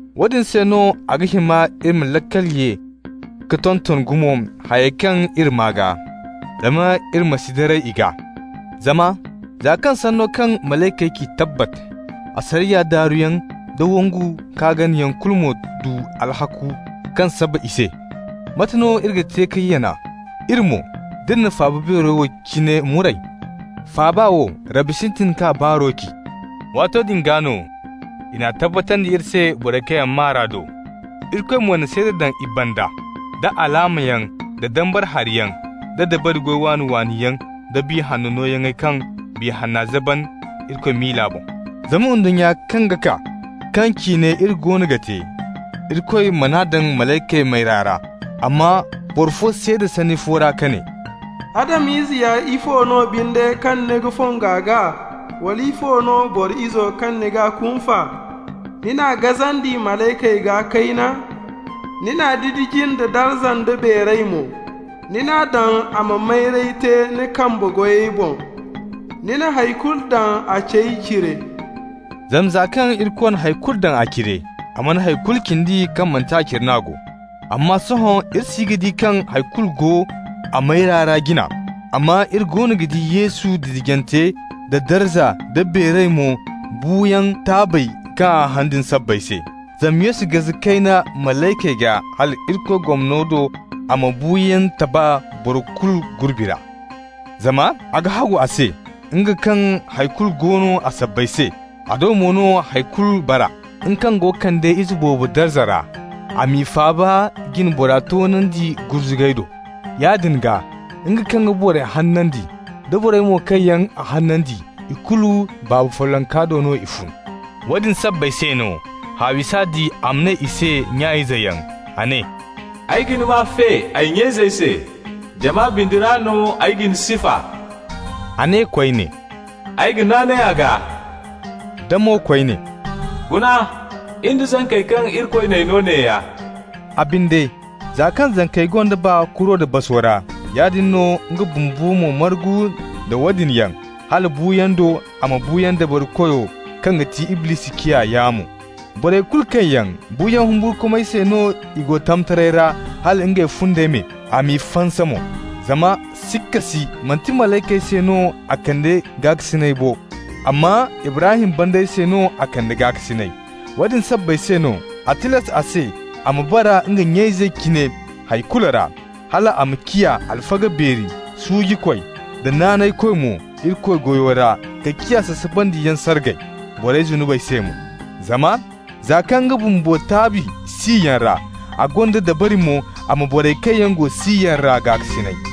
Woodin se no a ga hima iri ma laakal ye ka tonton gumo hayey kaŋ iri maa gaa, zama iri ma si daray i gaa. Zama za kaŋ sanno kaŋ malaykey ci tabbat, asariya daaruyaŋ da wangu-ka-ganayaŋ kulu mo du alhakku kaŋ saba i se, mate no iri ga te ka yana, iri mo, d'iri na faaba beero wo cine muray? Faaba wo, Rabbi sintin k'a baaro ci. Waato din gaa no i n'a tabbatandi iri se borey kaŋ maa r'a do. Irikoy mo na seeda daŋ i banda da alaamayaŋ da dambara hariyaŋ da dabari goy waani-waani yaŋ da Biya Hanno nooyaŋey kaŋ Biya Hanna zaban Irikoy miila boŋ. Zama ndunnya kaŋ ga kaa, kaŋ ciine iri goono ga te, Irikoy man'a daŋ malaykey mayra ra. Amma boro fo seeda sanni fo ra ka ne: «Adam-ize ya ifo no binde kaŋ ni ga fongu a gaa, wala ifo no boro izo kaŋ ni g'a kunfa? Ni n'a gazandi malaykey gaa kayna, ni n'a didiji nda darza nda beeray mo. Ni n'a daŋ a ma mayray te ni kambe goyey boŋ. Ni na hay kulu daŋ a cey cire.» Zama za kaŋ Irikoy na hay kulu daŋ a cire, a mana hay kulu cindi kaŋ manti a cire n'a go. Amma sohõ iri si ga di kaŋ hay kulu go a mayra ra jina. Amma iri goono ga di Yesu didijante nda darza nda beeray mo buuyaŋ taabey kaŋ a haŋ din sabbay se. Zama Yesu gaze kayna malaykey gaa hal Irikoy gomno do a ma buuyaŋ taba boro kulu gurbi ra. Zama a ga hagu a se, nga kaŋ hay kulu go no a sabbay se, a do mo no hay kulu bara, nga kaŋ go ga kande ize boobo darza ra, a m'i faaba jine bora toonandi gurzugay do. Yaadin gaa, nga kaŋ ga borey hanandi, da borey mo kaŋ yaŋ a hanandi, ikulu Baaba follonka do no i fun. Woodin sabbay se no, haawi s'a di a ma ne i se nya-izeyaŋ. A ne: «Ay ga ni maa fe ay nya-izey se, Jama bindi ra no ay ga ni sifa.» A ne koyne: «Ay ga naanay a gaa.» Da mo koyne: «Guna, in da zankey kaŋ Irikoy n'ay no neeya.» A binde, za kaŋ zankey gonda baa kuro da baso ra, yaadin no nga bumbo mo margu nda woodin yaŋ, hala buuyaŋ do a ma buuyaŋ dabarikoyo, kaŋ ga ti Iblisi, ciya yaamo. Borey kulu kaŋ yaŋ buuyaŋ humburkumay se no i go tamtaray ra hala ngey fundey me, a m'i fansa mo. Zama sikka si manti malaykey se no a kande gaakasinay bo, amma Ibrahim banda se no a kande gaakasinay. Woodin sabbay se no a tilas a se a ma bara nga nya-izey cine hay kulu ra, hal a ma ciya alfaga beeri suujikoy da naanaykoy mo Irikoy goyo ra ka ciya sasabandiyaŋ sargay borey zunubey se mo. Zama za kaŋ nga bumbo taabi siyaŋ ra, a gonda dabari mo a ma borey kaŋ yaŋ go siyaŋ ra gaakasinay.